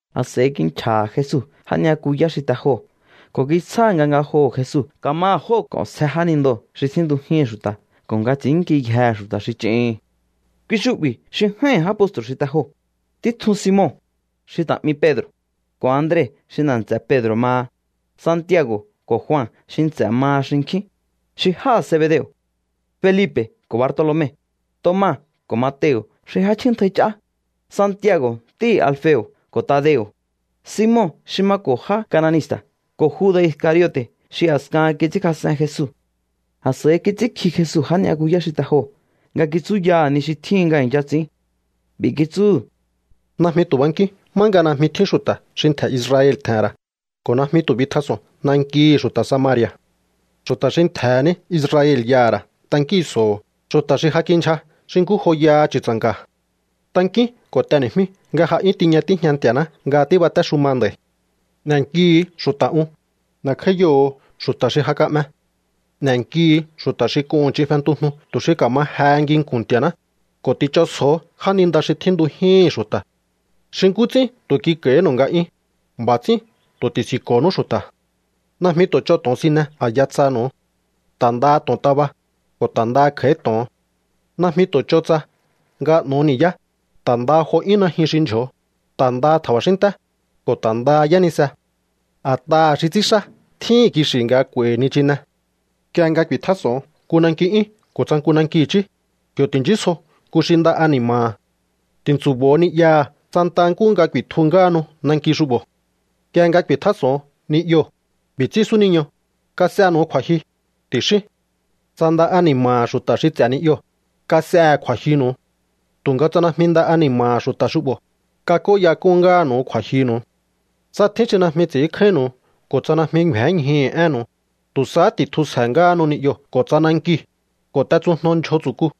A̱s'a̱i kinchja̱ha̱ Jesu já ni'yakuyá xi te joo̱ ko̱ kitsjáha̱ nga ngajoho̱ Jesu ka̱maha̱ jóo̱ k'o̱nsje jánindoo̱ xi tjíntujíhi̱n xu̱ta̱ ko̱ nga ts'i̱ínnkiyjehe̱ xu̱ta̱ xi ch'ihi̱n. Kui xu'bi̱ xi j'áíhi̱n já postru̱ xi te joo̱: títjun Simon, xi ta̱ 'mi Pedro̱, ko̱ Andre xi nda̱ nts'e̱ Pedro̱ maha; Santiago̱ ko̱ Jua xi nts'e̱ maha xinkjín, xi jáha̱ Zebedeo̱; Felipe̱ ko̱ Bartolome; Toma ko̱ Mateo̱ xi j'áchjíntjai ch'á; Santiago̱ ntíhi̱ Alfeo̱ ko̱ Tadeo̱; Simon xi mako̱ já kananista̱ ko̱ Juda̱ Iscariote̱ xi a̱skahan kits'ínkjas'en Jesu. A̱s'a̱i kits'ínkji Jesu já ni'yakuyá xi te joo̱ nga kitsúyaha̱ ni xi tjíhin nga i̱ncha ts'i̱ín. B'i̱ kitsúhu̱: —Najmi tu̱ bankíún má nga najmi tjín xu̱ta̱ xi ntje̱ Israel tje̱he̱n ra̱ ko̱ najmi tu̱ bitjas'o̱on nankihi̱ xu̱ta̱ Samari̱a̱. Xu̱ta̱ xi ntje̱he̱ ní Israel y'aha̱ ra̱ tankíhi̱nso̱ho̱, xu̱ta̱ xi ja kindyja xi nkú joyaha chu̱tsa̱nka̱. Tankíún ko̱ t'eni̱jmíú nga ja 'yún tiña tíjña Nti̱a̱ná nga tíbatéxuma nd'a̱i̱. N'e̱nkihu̱u xu̱ta̱ un, n'e̱kj'áíyoho̱o xu̱ta̱ xi ja ka'me, n'e̱nkihu̱u xu̱ta̱ xi k'uhu̱n ch'in fentujnu tu̱ xi ka̱ma jehe nginku̱n Nti̱a̱ná, ko̱ ti̱ch'onsjo̱o jáninda xi tjíntujíhi̱n xu̱ta̱. Xi nkú ts'ín tu̱ kik'a̱i̱hínu̱u nga'yún, b'a̱ ts'ín tu̱ ti̱si̱nko̱nú xu̱ta̱. ’Najmi tu̱ ch'o to̱onsine a̱ya tsanu̱u, ta̱ ndaha to̱ontaba, ko̱ ta̱ ndaha kj'a̱í to̱on. Najmi tu̱ ch'o tsa nga n'o̱o ni̱yá, ta̱ ndaha jo 'yún najyun xi ndyjo̱o, ta̱ ndaha tja̱ba̱xínnté, ko̱ ta̱ ndaha yánise. A̱t'aha̱ xi ts'ínxá tjíhi̱n kixi̱ nga k'u̱a̱i̱hi̱ nichine. ’Nk'ie nga ku̱i̱tjás'o̱on nku nanki 'yún ko̱ tsa nku nanki i̱chí, yo̱ ti̱nchísjo nku xi nda ani̱ma̱ha̱. Ti̱ntsu̱bo̱o ni'yaha̱ santa nkúhu nga ku̱i̱tju ngáhanu nanki xu'bo̱. Nk'ie nga ku̱i̱tjás'o̱on ni'yoo̱, b'i̱ ts'ín súniño: “Kas'enu̱u kju̱a̱jyu”, ti̱xíún. Tsa nda ani̱ma̱ha̱ xu̱ta̱ xi ts'e̱ ni'yoo̱, kas'ehe̱ kju̱a̱jyunu̱u. Tu̱nga tsa najmi nda ani̱ma̱ha̱ xu̱ta̱ xu'bo̱, kak'óyak'un ngáha̱nu̱u kju̱a̱jyunu̱u. ’Tsa tjín xi najmi ts'i̱ínkjáínnu̱u ko̱ tsa najmi ngju̱énñjuhu̱ énnu̱u, tu̱ sahá ti̱tjusje̱ ngáhanu ni'yoo̱ ko̱ tsa nankiu̱, ko̱ t'etsujno ndyjo tsu̱ku.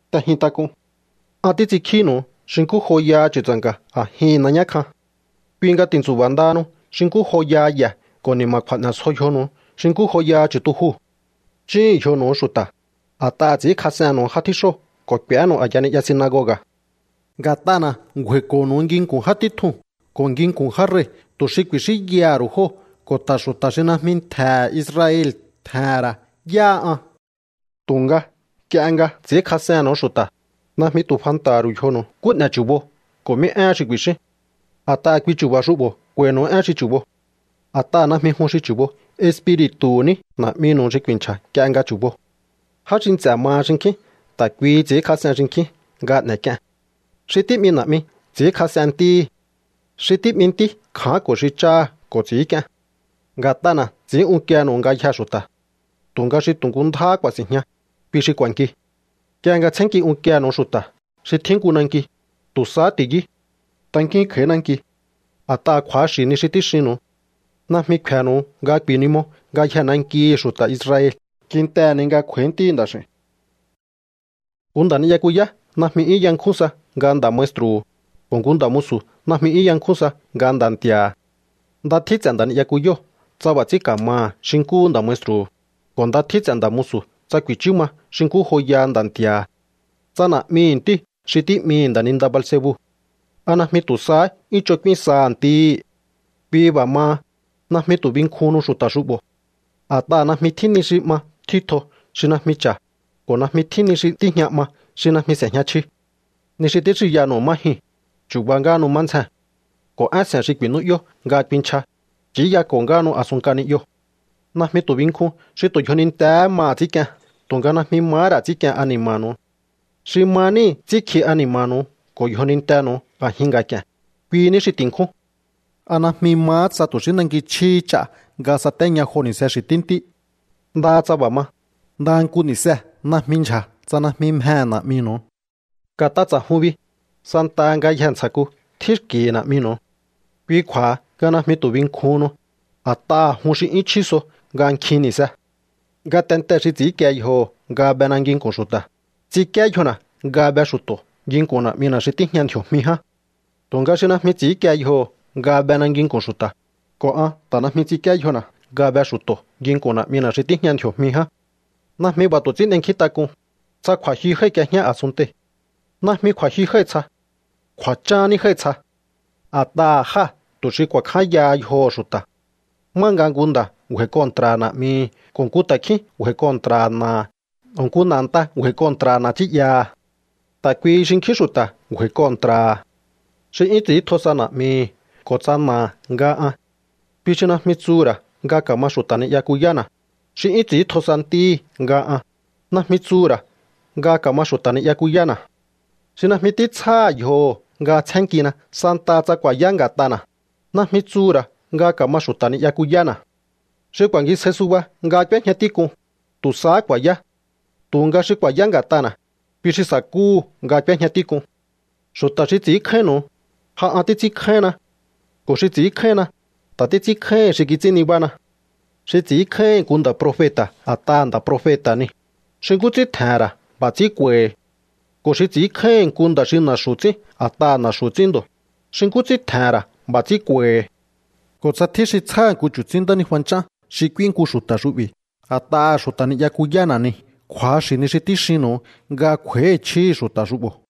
’T'ejin tak'un. An títs'inkjínu̱u xi nkú joyaha chu̱tsa̱nka̱ a̱jihi̱n nañá kjan. Kui nga ti̱ntsu̱ba̱ ndahanu xi nkú joyaha ye̱ ko̱ ni̱ma̱kju̱a̱ n'e̱sjo yjonu̱u xi nkú joyaha chu̱tujuu̱. Chúhu̱un yjonu̱u xu̱ta̱, a̱t'aha̱ ts'i̱ínkjas'ennu̱u já tjíxóo̱ ko̱ k'u̱énu̱u a̱ya ni'ya sinagoga̱. Nga̱t'ana̱ ngju̱a̱i̱ko̱nu̱u nginku̱n já títjuu̱n ko̱ nginku̱n já rei̱, tu̱ xi ku̱i̱xínyaha̱ ru̱u jóo̱ ko̱ ta̱ xu̱ta̱ xi najmi ntje̱he̱ Israel tje̱he̱n ra̱ yáha an. ’Tu̱nga nk'ie nga ts'i̱ínkjas'ennu̱u xu̱ta̱, najmi tu̱ fanta̱ha̱ ru̱u yjonu̱u nkú n'e̱ chu̱bo ko̱ mí éhen xi ku̱i̱xíún. A̱t'aha̱ kui chu̱ba̱ xu'bo̱ k'u̱a̱i̱nu̱u én xi chu̱bo. A̱t'aha̱ najmi jun xi chu̱bo, Espiri̱tu̱hu̱ ní Na̱'minu̱u xi ku̱i̱nchja̱ nk'ie nga chu̱bo. ’Já xi nts'e̱ maha xinkjín ta̱ kuihi ts'i̱ínkjas'en xinkjín nga n'e̱k'ien. Xi tí'mi na̱'mi ts'i̱ínkjas'en ntíhi̱. Xi tí'mi ntí kja̱ánko̱ xi cháha̱ ko̱ ts'i̱ínk'ien. Nga̱t'ana̱ ts'i̱ín unkiehe̱nu̱u ngayjee̱ xu̱ta̱. Tu̱nga xi tu̱ nku ndjáhá ku̱a̱si̱njña, kui xi k'u̱a̱nki. Nk'ie nga tsjénnki unkienu̱u xu̱ta̱ xi tjín nku nanki, tu̱ sahá ti̱yú. Tankíún kj'a̱í nanki. A̱t'aha̱ kju̱axi̱ ni xi tíxinnu̱u. Najmi kfe̱nu̱u nga ku̱i̱nimo ngayjee̱ nankihi̱ xu̱ta̱ Israel kintehe̱ ni nga kj'u̱a̱í Ntíhi̱ Nda̱x'i̱u̱n. ’Nku nda̱ ni'yakuyá najmi 'yún yankjún sa nga nda̱ maestru̱hu̱, ko̱ nku nda̱ musu̱ najmi 'yún yakjún sa nga nda̱ nti̱a̱ha̱. Nda tjín ts'e̱ nda̱ ni'yakuyóo̱ tsa b'a̱ ts'ín ka̱maha̱ xi nkúhu nda̱ maestru̱hu̱, ko̱ nda tjín ts'e̱ nda̱ musu̱ tsa ku̱i̱chú ma xi nkú joyaha nda̱ nti̱a̱ha̱. Tsa na̱'mihi̱ ntíu̱ xi tí'mihi̱ nda̱ninda Beelzebu, ¿a najmi tu̱ sahá 'yún ch'on k'úín saha̱ ntíhí? ’Kui b'a̱ maha, najmi tu̱ binkjuhunnu xu̱ta̱ xu'bo̱. A̱t'aha̱ najmi tjín ni xi 'ma tjítjo xi najmi cha̱, ko̱ najmi tjín ni xi tíjña 'ma xi najmi s'e̱jña chji. Ni xi tíxinyanu̱u má jyuu̱n, chu̱ba ngáhanu má ndzjee̱n. Ko̱ én se̱n xi ku̱i̱nú'yó nga kuinchja, ch'i̱íyako̱ ngáhanu a̱sun nk'a ni'yoo̱. Najmi tu̱ binkjun xi tu̱ yjonintee̱hé maha̱ ts'ínk'ien tu̱nga najmi mahá ra̱ ts'i̱ínk'ien ani̱ma̱nu̱u. Xi ma níhi̱ ts'ínkji ani̱ma̱nu̱u ko̱ yjonintenu̱u a̱jin nga̱k'i̱e̱n, kui ní xi ti̱nkjún. ’¿A najmi mahá tsa tu̱ xí nanki chjíhí ch'a nga satéña jo ni̱se xi̱ tíntí? Ndaha tsa b'a̱ ma, ndaha nku ni̱see̱ najmi ndyja̱ tsa najmi mjehe̱ Na̱'minu̱u. Nga̱t'a ts'a̱jun bi, santaha ngayjee̱ ntsja̱ku tjín xki̱hi̱ Na̱'minu̱u. Kui kju̱a̱ha nga najmi tu̱ binkjuhunnu, a̱t'aha̱ jun xi 'yún chjí so nga nkjin ni̱se. ’Ngatentee̱ xi ts'i̱ínkie yjoho̱ nga bena nginku̱n xu̱ta̱, ts'inkíé yjona̱ nga be xu̱to̱ nginku̱n Na̱'mina̱ xi tíjña ndji̱o̱jmi ján. Tu̱nga xi najmi ts'i̱ínkie yjoho̱ nga bena nginku̱n xu̱ta̱, ko̱ an ta̱ najmi ts'inkíé yjona̱ nga be xu̱to̱ nginku̱n Na̱'mina̱ xi tíjña ndji̱o̱jmi ján. ’Najmi b'a̱ tu̱ ts'ín n'enkjíntak'un, tsa kju̱a̱jyu jái̱k'iejñá a̱sunntei̱. Najmi kju̱a̱jyu jái̱ tsja. Kju̱a̱chán ní jái̱ tsja. A̱t'aha̱ jáa̱ tu̱ xi ku̱a̱kjányaha yjoho̱ xu̱ta̱, má nga nku nda̱ ngju̱a̱i̱ kontra̱ha̱ na̱'mihi̱ ko̱ nku ta̱kjín ngju̱a̱i̱ kontra̱ha̱ na̱aha̱ ko̱ nku na̱ a̱nta ngju̱a̱i̱ kontra̱ha̱ na̱ nchí'yaha̱. Ta̱ kuihi xinkjín xu̱ta̱ ngju̱a̱i̱ kontra̱ha̱. ’Xi 'yún ts'i̱íntjo sa na̱'mihi̱ ko̱ tsa na̱aha̱ nga an, kui xi najmi tsuhu̱ ra̱ nga ka̱ma xu̱ta̱ ni'yakuyána̱. Xi 'yún ts'i̱íntjo sa ntíhi̱ nga an, najmi tsuhu̱ ra̱ nga ka̱ma xu̱ta̱ ni'yakuyána̱. Xi najmi títsjáha̱ yjoho̱ nga tsjénnkina santaha tsa ku̱a̱yá nga̱t'ana̱, najmi tsuhu̱ ra̱ nga ka̱ma xu̱ta̱ ni'yakuyána̱. Xi ku̱a̱ngisjáí suba nga k'úéjña tík'un, tu̱ sahá ku̱a̱yá. Tu̱nga xi ku̱a̱yá nga̱t'ana̱, kui xi sa̱kúhu̱ nga k'úéjña tík'un. ’Xu̱ta̱ xi ts'i̱ínkjáínnu̱u, ja an títs'ínkjáínna. Ko̱ xi ts'i̱ínkjáínna, ta̱ títs'ínkjáíhi̱n xi kits'ín nibána. Xi ts'i̱ínkjáíhi̱n nku nda̱ profeta̱ a̱t'aha̱ nda̱ profeta̱ nii̱, xi nkú ts'ín tje̱he̱n ra̱ b'a̱ ts'ín k'u̱a̱i̱hi̱. Ko̱ xi ts'i̱ínkjáíhi̱n nku nda̱ xi na̱xu̱ ts'ín a̱t'aha̱ na̱xu̱ ts'ín ndo̱, xi nkú ts'ín tje̱he̱n ra̱ b'a̱ ts'ín k'u̱a̱i̱hi̱. Ko̱ tsa tjín xi tsjáha̱ nku chu̱tsín ntánijua nch'án xi k'úí nku xu̱ta̱ xu'bi̱ a̱t'aha̱ xu̱ta̱ ni'yakuyána̱ nii̱, kju̱axi̱ ni xi tíxinnu̱u nga kj'u̱a̱i̱hi̱ chjíhi̱ xu̱ta̱ xu'bo̱.